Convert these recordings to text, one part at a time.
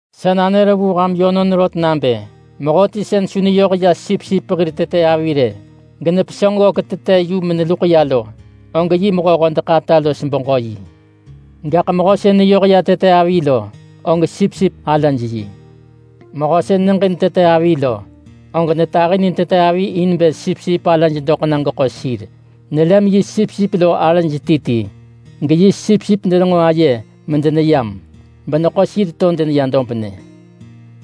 “Sa nanër vu ham yönon rot nabë mehöti sën su neyoh ya sipsip hir tete avi rë genepesönġ ggök tete yu meneluḳ ya lo, og yi mehö-hodeḳ-ata los beġö-yi. Gaḳ mehö sën neyoh ya tete avi lo, og sipsip alaj yi. Mehö sën neġin tete avi lo, og netahinin tete avi in bë sipsip alaj doḳ na geḳo sir. Nelem yi sipsip lo arëj ti ti, geyi sipsip denenġo aye medeneyam beneḳo sir to deneya dobnë.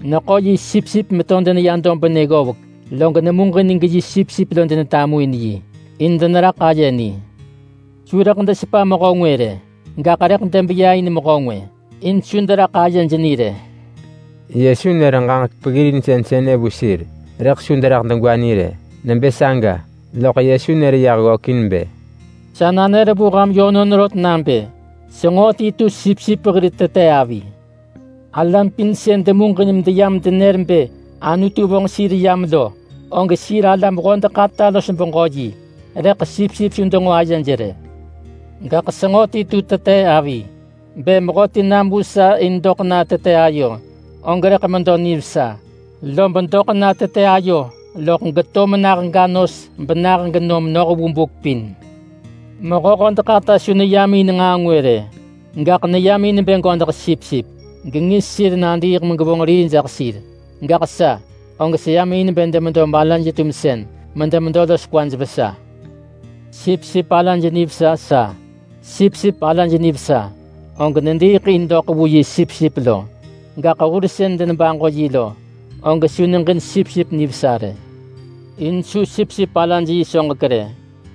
Neḳo yi sipsip meto deneya dobnë ggovek, log nemuġin geyi sipsip lo denetamuin yi, in deneraḳ aye ni. Su rëḳ desepa mehö ngwë rë. Gaḳ rëḳ debeya in mehö ngwë in su deraḳ ayej ni rë.” Yesu nër ġaġek peggirinsën sënë vu sir, rëḳ su deraḳ degwa ni rë. Nebë saga lom Yesu nër yah ggökin bë, “Sa nanër vu ham yönon rot nabë senġo ti tu sipsip hir tete avi. Alam pin sën demuġin meyam denër bë Anutu vonġ sir yam lo, og sir alam-hodeḳ-ata los beġö-yi. Rëḳ sipsip su denġo ayej rë. Gaḳ senġo ti tu tete avi. Bë mehöti nam vu sa in bë doḳ na tete ayo, og rëḳ medo nivesa, lob doḳ na tete ayo gegeto mena mega nos benah genom noh vu buk pin. Mehö-hodeḳ-ata su neyam in nġaa ngwë rë. Gaḳ neyam in bë godeḳ sipsip gengis sir nadiiḳ megevonġ rii jaḳ sir. Gaḳ sa, og seyam in bë demedo malaj-tumsën medemedo los kwaj vesa. Sipsip alaj nivesa sa. Sipsip alaj nivesa, og nediiḳ in doḳ vu yi sipsip lo. Gaḳ hur sën denebaġo yi lo, og su neġin sipsip nivesa rë. In su sipsip alaj yi soġek rë,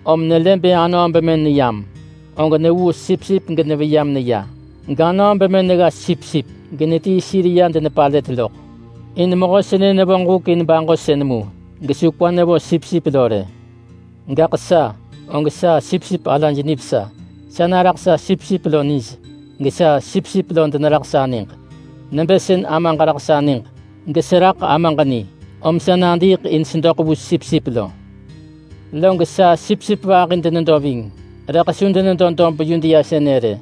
om nelë bë anöö bemën neyam, og nevuu sipsip geneveya meneya, ganöö bemën negga sipsip genetii sir ya denepalët loḳ. In mehö sënë nevonġ huk in baġosën mu gesu kwa nevo sipsip lo rë. Gaḳ sa, og sa sipsip alaj nivesa. Sa naraḳ sa sipsip lo nij, gesa sipsip lo deneraḳ sa niġ, nebë sën Amaġ raḳ sa niġ geseraḳ Amaġ ni. Om sa nadiiḳ in sedoḳ vu sipsip lo. Log sa sipsip vahi denedo ving, rëḳ su denedo dob Yudea sënë rë.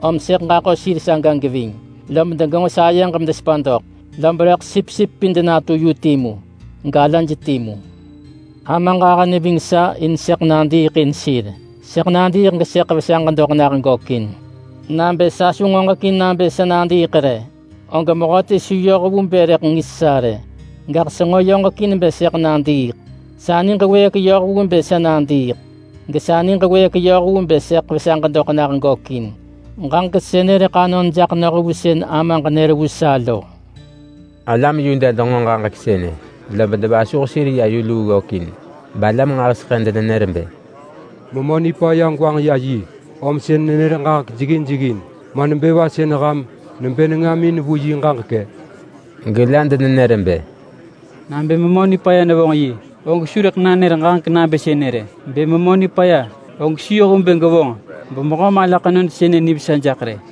Om sëḳ ġaḳo sir saga geving lom degenġo sayeġ medesepa doḳ. Lob rëḳ sipsip pin denatu yu timu, galaj timu. Amaġ ahë neving sa in sëḳ nadiiḳ in sir. Sëḳ nadiiḳ gesëḳ vesaġ doḳ nah gökin. Nabë sa su ngoġekin nabë sa nadiiḳ rë, og mehöti su yoh vu bë rëḳ ngis sa rë. Gaḳ senġo yoġekin bë sëḳ nadiiḳ. Sa niġ wëëk yoh vu bë sa nadiiḳ, gesa niġ wëëk yoh vu bë sëḳ vesaġ doḳ nah gökin. Ġaġek sënë rëḳ anon jaḳ noh vu sën Amaġ nër vu sa lo.” Alam Yuda denġo ġaġek sënë lob devasuh sir ya yu luu ggökin. Balam nġahiseḳë denenër bë, “Memö nipaya gwanġ ya yi, om sën nenër ġaġek jeggin jeggin. Ma nebë va sën ham nebë nengamin vu yi ġaġek-ë?” Gela denenër bë, “Nabë memö nipaya nevonġ yi, og su rëḳ nanër ġaġek nabë sënë rë! Bë memö nipaya, og su yoh vu bë gevonġ bemehö mala ḳenod sënë nivesa jaḳ rë!”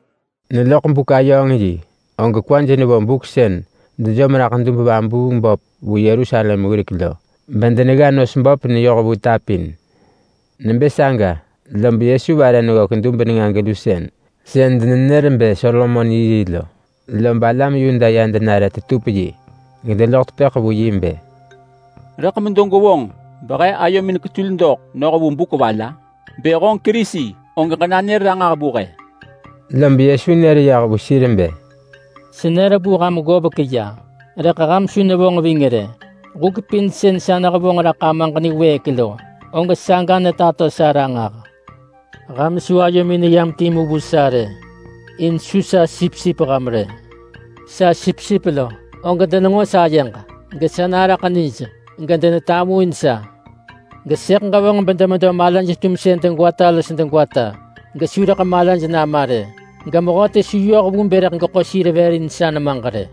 Neloḳ buk-ayööng-yi og kwaj nevo buk sën dejom raḳ dub-vabuung-böp vu Yerusalem wirek lo bedenegga nos böp neyoh vu ta pin. Nebë saga lob Yesu vare neggök dub nenga-gelusën sën denenër bë Solomon yi yi lo, lob alam Yuda ya denare tetup yi, gedeloḳ tepëḳ vu yi bë, “Rëḳ medo gwevonġ behe ayomin ketul doḳ noh vu buk va la? Bë honġ Kerisi, og ġenanër ranġah vu he.” Lob Yesu nër yah vu sir bë, “Senër vu ham ggovek ya, rëḳ ham su nevonġ ving rë. Huk pin sën sa nehevonġ raḳ Amaġ niwëëk lo, og saga netato sa ranġah. Ham su ayomin neyam timu vu sa rë, in su sa sipsip ham rë. Sa sipsip lo, og denenġo sayeġ, gesa naraḳ nij, gedenetamuin sa. Gesëḳ ġevonġ bedemedo malaj-tumsën degwata los degwata gesu rëḳ malaj nama rë. Gemehöti su yoh vu bë rëḳ geḳo sir vër in sa nemaġ rë.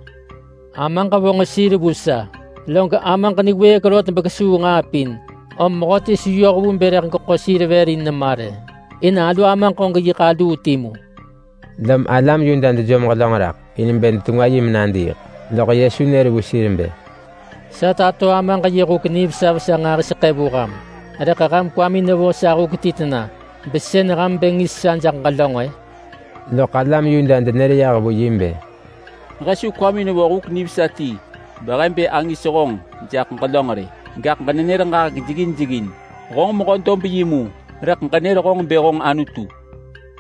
Amaġ vonġ sir vu sa, log Amaġ niwëëk rot bekesuu nġaa pin, om mehöti su yoh vu bë rëḳ geḳo sir vër in nema rë. In alu Amaġ og yiḳ aluu timu.” Lom alam Yuda dejom ġelönġ raḳ in bë detengwa yi menadiiḳ. Loḳ Yesu nër vu sir bë, “Sa tato Amaġ yi huk nivesa vesa nġahiseḳë vu ham, rëḳ ham kwamin nevo sa huk ti tena besën ham bë ngis sa jaḳ ġelönġ-ë?” Loḳ alam Yuda denër yah vu yi bë, “He su kwamin vo huk nivesa ti behe bë angis honġ jaḳ ġelönġ rë! Gaḳ ġenenër ġaġek jeggin jeggin. Honġ mehö dob yi mu, rëḳ ġenër honġ bë honġ Anutu.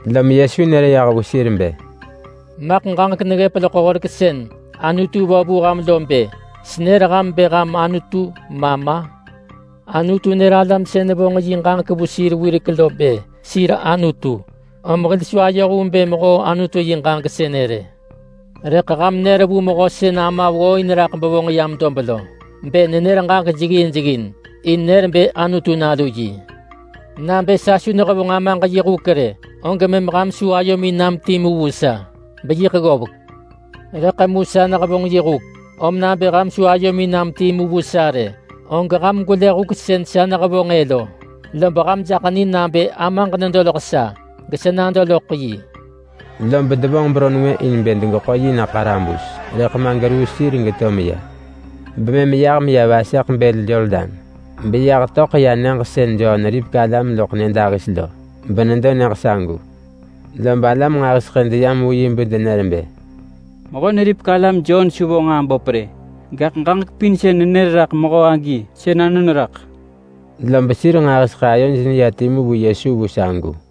Lom Yesu nër yah vu sir bë, “Maḳ ġaġek neggëp loḳ horek sën Anutu vo vu ham lo bë, ‘Senër ham bë ham anutu’ ma ma? Anutu nër alam sën vonġ yi ġaġek ya vu sir wirek lo bë sir anutu, om hil su ayoh vu bë mehoo Anutu yi ġaġek sënë rë. Rëḳ ham nër vu Mehö sën Ama ggooin raḳ bevonġ yam dob lo bë nenër ġaġek jeggin jeggin in nër bë Anutu nalu yi! Nabë sa su nehevonġ Amaġ yi huk rë, og mëm ham su ayomin nam timu vu sa beyiḳ ggovek. Rëḳ mu sa nehevonġ yi huk, om nabë ham su ayomin nam timu vu sa rë, og ham gwelë huk sën sa nehevonġ-ë lo, lob ham jaḳ ni nabë Amaġ nedo loḳ sa, gesa nado loḳ yi.” Lob devonġ beron ngwë in bë degeḳo na ḳarabus, rëḳ ma geruu sir geto meya. Bemëm yah meya vaseḳ bël Yordan beyah töḳ ya nyëġ sën Jon neripek alam loḳ nyëdahis lo, benedo nyëġ sagu. Lob alam nġahiseḳë deyam vu yi bedenër bë, “Mehö-neripek-alam Jon su vonġ nġaa böp rë, gaḳ ġaġek pin sën nenër raḳ mehö agi, sën anon raḳ.” Lob sir nġahiseḳë ayoj neya timu vu Yesu vu sagu.